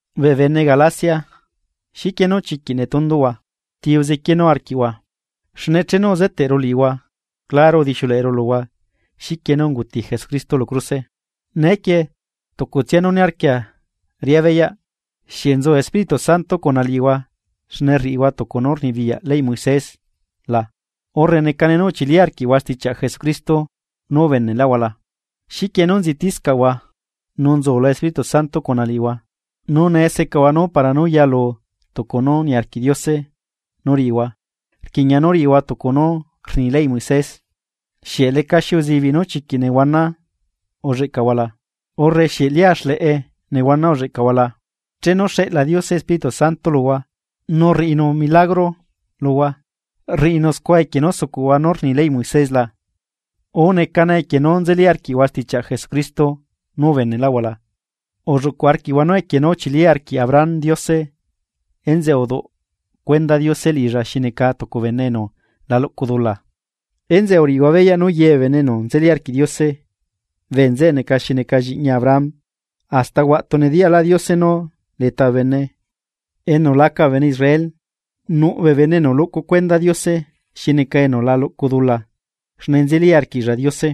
¡Bee bene Galacia! ¿Xiquie nú chiquiꞌ netunduhua? ¿Ti uzequienuu arquiꞌhua? Xne chenu uzeteꞌru liꞌihua, claro udixiuleꞌeru luhua xiquie nú unguti Jesucristo lu cruse. Neequie tucutsia nú niarquia riꞌá beyaꞌ: ¿Xieꞌ nzu Espíritu Santo cuna liꞌihua xne rriꞌihua tucu nú rnibiyaꞌ leyꞌ Moisés la, urre necane nú uchili arquiꞌhua stichiaꞌ Jesucristo nú ubeneꞌlaꞌhua la? ¿Xiquie nú nzitiscaꞌhua, nu nzula Espíritu Santo cuna liꞌihua nu nee secahua nú para nú yalu tucu nú niarquiꞌ Diose nú riꞌihua rquiꞌña nú riꞌihua tucu nú rni leyꞌ Moisés? ¿Xieꞌ lecaxi uzibiꞌ nú chiquiꞌ nehuana ulleꞌcahua la, o xieꞌ lia xleꞌe nehuana ulleꞌcahua la? Chenu xeꞌla Diose Espíritu Santo luhua nu rriꞌinu milagro luhua, ¿rriꞌinu scua equie nú sucuꞌhua nú rni leyꞌ Moisés la? o ¿necane equie nú nzeli arquiꞌhua stichiaꞌ Jesucristo nú ubeneꞌlaꞌhua la? Ulluꞌcu arquiꞌhua nú equie nú uchili arquiꞌ Abraham Diose enzeꞌe uduꞌ cuenda Diose liꞌilla xi neca tucu bene enu la luꞌcu dula. Enzeꞌe, uriꞌihua beyaꞌ nú ye bee bene enu nzeli arquiꞌ Diose, bee nzeꞌe neca xi neca lliꞌñi Abraham. Hasta huaꞌtu nediyaꞌlaꞌ Diose nú leta bee bene enu laca bee bene Israel nuꞌ bee bene enu luꞌcu cuenda Diose xi neca enu la luꞌcu dula xne nzeli arquiꞌlla Diose.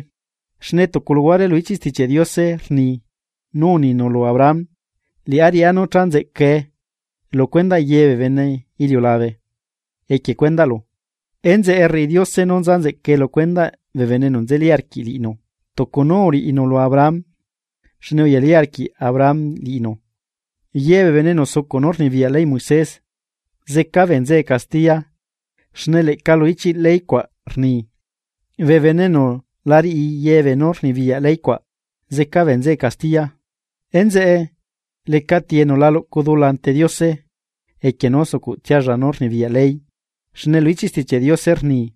Xne tucu luhuare lu ichiꞌ Stichiaꞌ Diose rni nú uninu lu Abraham: “Liꞌá riꞌá nú cha nzeꞌcae lu cuendaꞌ yebee bene iliulabe equie cuendaꞌlu.” Enzeꞌe, rriꞌi Diose nú nza nzeꞌcae lu cuendaꞌ bee bene enu nzeli arquiꞌ liꞌinu tucu nú uriꞌinu lu Abraham xne uyali arquiꞌ Abraham liꞌinu. Ye bee bene enu sucuꞌ nú rnibiyaꞌ leyꞌ Moisés zeca bee nzeꞌe castiya xne leꞌca lu ichiꞌ leycuaꞌ rni: “Bee bene enu la riꞌi ye beenú rnibiyaꞌ leycuaꞌ, zeca bee nzeꞌe castiya.” Enzeꞌe, ¿lecati enu la luꞌcu dula ante Diose equie nú sucuꞌtsialla nú rnibiyaꞌ ley? Xne lu ichiꞌ Stichiaꞌ Diose rni: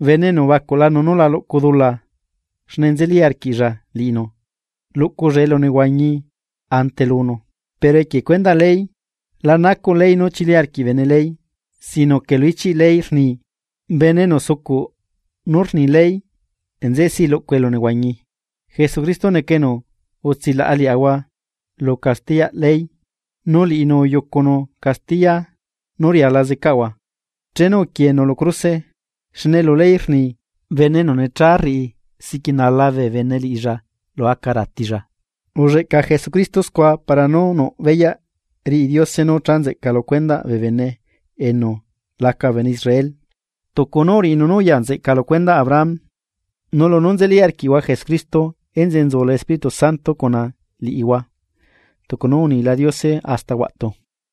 “Bene enu ubacuꞌlanu nú la luꞌcu dula xne nzeli arquiꞌlla liꞌinu luꞌculla elunehuañi ante lunu.” Pero equie cuendaꞌ ley, la nacuꞌ ley nú chili arquiꞌ bene ley sino que lu ichiꞌ ley rni: “Bene enu sucuꞌ nú rni ley nzeꞌe si luꞌcu elunehuañi.” Jesucristo neca enu utsilaꞌa liaꞌahua lu castiyaꞌ ley nu liꞌinu uyucunu castiya nú riala zecaꞌahua, chenu uquienu lu cruse, xne lu ley rni: “Bene enu necha rriꞌi siꞌquinala bee bene liꞌilla lu aca ratilla.” Ulleꞌca Jesucristo scua para nú nuꞌ beyaꞌ riꞌi Diose nú cha nzeꞌca lu cuendaꞌ bee bene enu laca bee bene Israel, tucu nú uriꞌinu nú uya nzeꞌca lu cuendaꞌ Abraham. Nu lunú nzeli arquiaꞌahua Jesucristo enzeꞌe nzula Espíritu Santo cuna liꞌihua tucu nú unila Diose hasta huaꞌtu.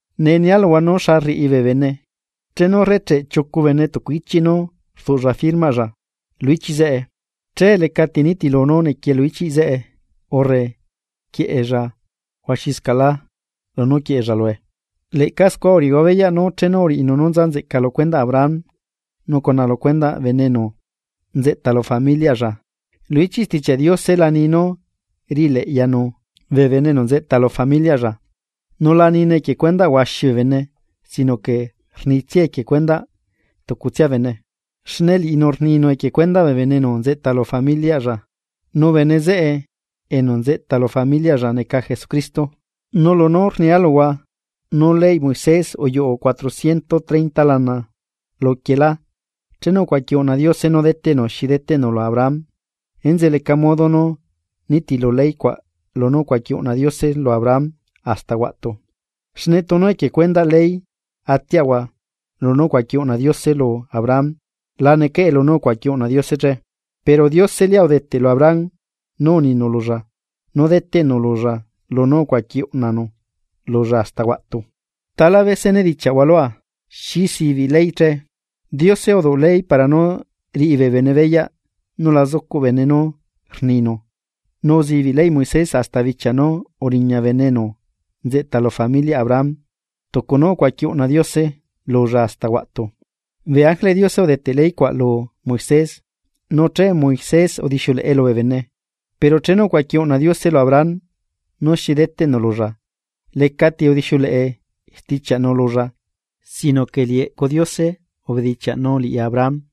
Nee nia luhua nú xa rriꞌi bee bene, chenu rrecheꞌ chiucu bene tucu ichiꞌ nu rduꞌlla firmaꞌlla lu ichiꞌ zeꞌe, che lecaꞌ ti nitilu nú nequie lu ichiꞌ zeꞌe urre quieꞌella huaxiscaꞌlá lunú nequie lue. Leꞌca scua uriꞌihua beyaꞌ nú chenu uriꞌinu nú nza nzeꞌca lu cuendaꞌ Abraham nu cuna lucuendaꞌ bene enu nzeꞌta lu familiaꞌlla, lu ichiꞌ Stichiaꞌ Diose la ni nú riꞌileꞌyanu “bee bene enu nzeꞌta lu familiaꞌlla”, nu la nine equie cuendaꞌ huaxi bee bene sino que rnitsiae equie cuendaꞌ “tucutsia bene”; xne liꞌinu rninu equie cuendaꞌ bene enu nzeꞌta lu familiaꞌlla. Nu bene zeꞌe enu nzeꞌta lu familiaꞌlla neca Jesucristo. Nu lunú rnia luhua nú leyꞌ Moisés uyuꞌu cuatrocientos treinta lana luquielá chenu ucuaqui uꞌna Diose nú deteꞌnu xi deteꞌnu lu Abraham. Enzeꞌe leca modo nú nitilu ley cuaꞌ lunú ucuaqui uꞌna Diose lu Abraham hasta huaꞌtu. Xne tunu equie cuendaꞌ ley atiaꞌahua lunú ucuaqui uꞌna Diose lu Abraham. La necaꞌe lunú ucuaqui uꞌna Diose che. Pero Diose lia udeteꞌ lu Abraham nú uninu lulla nú deteꞌnu lulla lunú ucuaqui uꞌnanu lulla hasta huaꞌtu. Tala bese nedichaꞌhua lua: ¿Xi sibiꞌ ley che? Diose uduꞌ ley para nú riꞌi bee bene beyaꞌ nú la zucuꞌ bene nú rninu nu uzibiꞌ leyꞌ Moisés hasta bichia nú uriña bene enu nzeꞌta lu familiaꞌ Abraham tucu nú ucuaqui uꞌna Diose lulla hasta huaꞌtu. Bee ángeleꞌ Diose udeteꞌ ley cuaꞌ lu Moisés, nu che Moisés udixiuleꞌe lubee bene. Pero chenu ucuaqui uꞌna Diose lu Abraham nú xi deteꞌnu lulla lecati udixiuleꞌe stichiaꞌnu lulla sino que liꞌi eꞌcu Diose ubedichiaꞌnu liꞌi Abraham.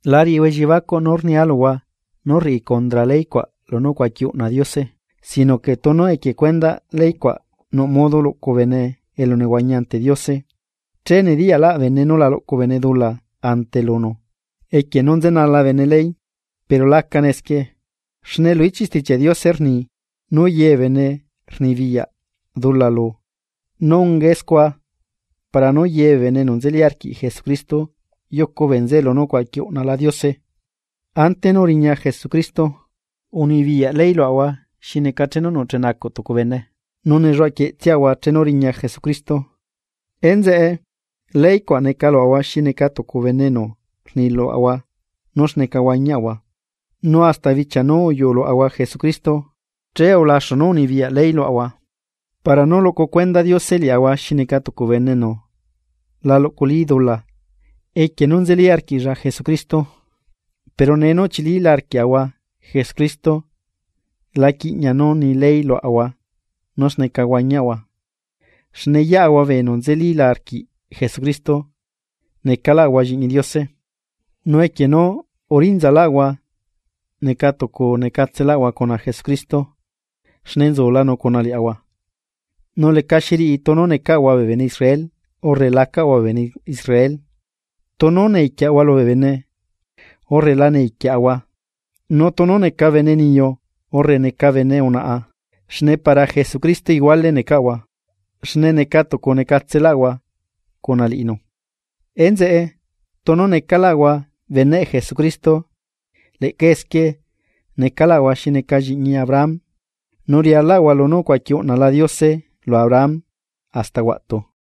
La riꞌihua elliebacuꞌ nú rnia luhua nú rriꞌi cundra leycuaꞌ lunú ucuaqui uꞌna Diose. Sino que tunu equie cuendaꞌ leycuaꞌ nuꞌ modo luꞌcu bene elunehuañi ante Diose che nediyaꞌlaꞌ bene nú la luꞌcu bene dula ante lunu equie nú nzenala bene ley. Pero lacane esquie. Xne lu ichiꞌ Stichiaꞌ Diose rni nú yebee bene rnibiyaꞌ dula lu nu ungae scua para nú yebee bene enu nzeli arquiꞌ Jesucristo yucu bee nzeꞌe lunú ucuaqui uꞌnala Diose. Ante nú riña Jesucristo, unibiyaꞌ ley luaꞌahua xi neca chenu nucheꞌnacuꞌ tucu bene, nu nelluaquieꞌtsiaꞌahua chenu riña Jesucristo. Enzeꞌe, ley cuaꞌ neca luaꞌahua xi neca tucu bene enu rni luaꞌahua nú xneca huañiaꞌahua nu hasta bichia nú uyuluaꞌahua Jesucristo che ulaxu nú unibiyaꞌ ley luaꞌahua para nú luꞌcu cuenda Diose liaꞌahua xi neca tucu bene enu la luꞌculi dula equie nú nzeli arquiꞌlla Jesucristo. Pero nee nú uchilila arquiaꞌahua Jesucristo la quiꞌña nú ni ley luaꞌahua nú xneca huañiaꞌahua. Xne yeꞌahua bee enu nzelila arquiꞌ Jesucristo necaꞌlaꞌahua lliꞌñi Diose. Nu equie nú urinzalaꞌahua necatucu necatselaꞌahua cuna Jesucristo xne nzulanu cuna liaꞌahua. Nu lecaxiriꞌi tunu necaꞌahua bee bene Israel urre lacaꞌahua bee bene Israel, tunu necaꞌahua esclavo lubee bene, o lacaꞌahua esclavo, nu tunu neca bene niyu urre neca bene unaꞌa xne para Jesucristo iguale necaꞌahua xne neca tucu necatselaꞌahua cuna liꞌinu. Enzeꞌe, tunu necaꞌlaꞌahua beneꞌ Jesucristo leꞌca esquie necaꞌlaꞌahua xi neca lliꞌñi Abraham, nu rialaꞌahua lunú ucuaqui uꞌnala Diose lu Abraham hasta huaꞌtu.